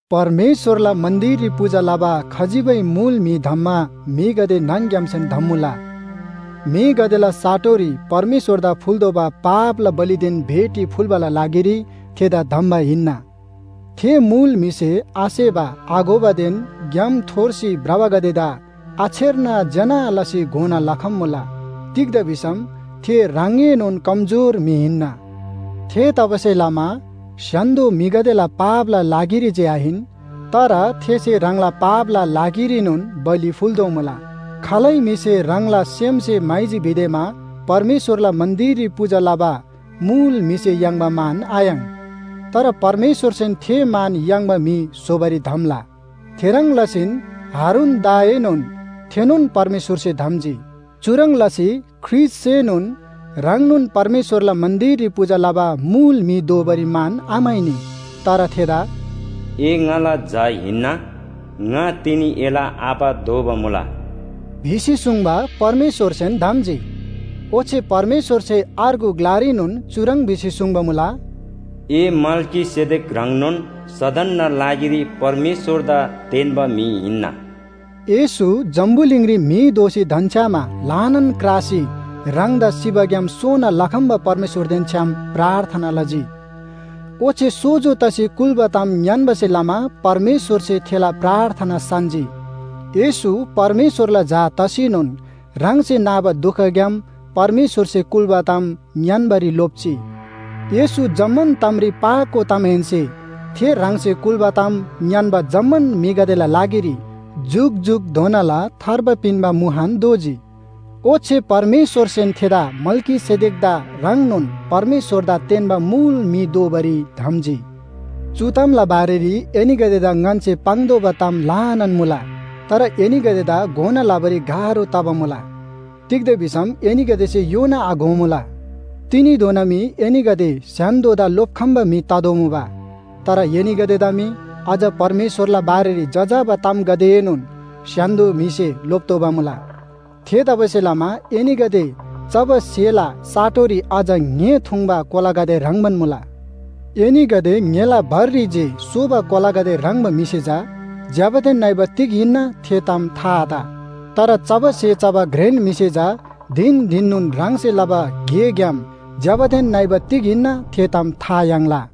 परमेश्‍वरला मन्‍दिररी पूजा लबा खजिबै मुल म्‍हि धम्‍मा म्‍हिगदे न्‍हङ‌ग्‍यामनोन धम्‍मुला। म्‍हिगदेला साटोरी परमेश्‍वरदा फुल्‍तोःबा पापला बलिदेन भेटी फुल्‍बाला लागिरी थेदा धम्‍बा हिन्‍ना। थे मुल म्‍हिसे आसेबा आघोबादेन ग्‍याम थोर्सी भ्रबागदेदा आछेर्ना ज्‍यना लसी घोना लखम्‍मुला। तिग्‍दा भिसम थे ह्राङएनोन कमजोर म्‍हि हिन्‍ना। थेतबासेलमा स्‍य्‍हान्‍दो म्‍हिगदेला पापला लागिरी जे आहिन, तर थेसे ह्राङला पापला लागिरीनोन बलि फुल्‍तोःमुला। खालै म्‍हिसे ह्राङला सेमसे म्‍हाइजी भिदेमा परमेश्‍वरला मन्‍दिररी पूजा लबा मुल म्‍हिसे याङ्बा मान आयाङ्। तर परमेश्‍वरसेन थे मान याङ्बा म्‍हि स्‍होबारी धम्‍ला। थेह्रङ् लसीन हारूनदाएनोन थेनोन परमेश्‍वरसे धम्‍जी। चुह्रङ् लसी ख्रीष्‍टसेनोन ह्राङनोन परमेश्‍वरला मन्‍दिररी पूजा लबा मुल म्‍हि दोबारी मान आम्‍हाइनी। तर थेदा “ए ङाला झा हिन्‍ना, ङा तिनी एला आबा दोबा मुला” भिसी सुङ्बा परमेश्‍वरसेन धम्‍जी। ओच्‍छे परमेश्‍वरसे अर्गु ग्‍लारीनोन चुह्रङ् भिसी सुङ्बा मुला, “ए मल्‍कीसेदेक ह्रङ्नोन सदनना लागिरी परमेश्‍वरदा तेन्‍बा म्‍हि हिन्‍ना” येशू जम्‍बुलिङरी म्‍हि दोसी धन्‍छ्‌यामा ल्‍हानान क्रासी ह्राङदा सिबाग्‍याम सोना लखम्‍बा परमेश्‍वरदेन छ्‌याम प्रार्थना लजी। ओच्‍छे सोजो तसी कुल्‍बा ताम ङ्‌यान्‍बासे लमा परमेश्‍वरसे थेला प्रार्थना सान्‍जी। येशू परमेश्‍वरला झा तसीनोन ह्राङसे नाबा दुखग्‍याम परमेश्‍वरसे कुल्‍बा ताम ङ्‌यान्‍बारी लोप्‍जी। येशू जम्‍मान तामरी पाको तमाहेन्‍से थे ह्राङसे कुल्‍बा ताम ङ्‌यान्‍बा जम्‍मान म्‍हिगदेला लागिरी जुकजुकधोना थार्बा पिन्‍बा मुहान दोजी। ओच्‍छे परमेश्‍वरसेन थेदा मल्‍कीसेदेकदा ह्रङ्नोन परमेश्‍वरदा तेन्‍बा मुल म्‍हि दोबारी धम्‍जी। चु तामला बारेरी एनीगदेदा ङन्‍से पाङ्तोःबा ताम ल्‍हानान मुला। तर एनीगदेदा घोना लबारी गाह्रो तबा मुला। तिग्‍दा भिसम एनीगदेसे योना आघोमुला। तिनीधोना मी एनीगदे स्‍य्‍हान्‍दोदा लोप्‍खम्‍बा म्‍हि ततोःमुबा। तर एनीगदेदा मी अझ परमेश्‍वरला बारेरी जजाबा तामगदेएनोन स्‍य्‍हान्‍दो म्‍हिसे लोप्‍तोःबा मुला। थेतबासेलमा एनीगदे चबा स्‍हेला साटोरी अझ ङ्‍हे थुङ्बा कोलागदे ह्रङ्‌बान मुला। एनीगदे ङ्‍हेला भररी जे सोबा कोलागदे ह्रङ्‌बा म्‍हिसे चा ज्‍यबादेन नइबा तिग हिन्‍ना थे ताम था आत। तर चबा स्‍हे चबा घ्रेन म्‍हिसे चा धिन धिननोन ह्राङसे लबा गेग्‍याम ज्‍यबादेन नइबा तिग हिन्‍ना थे ताम था याङ्ला।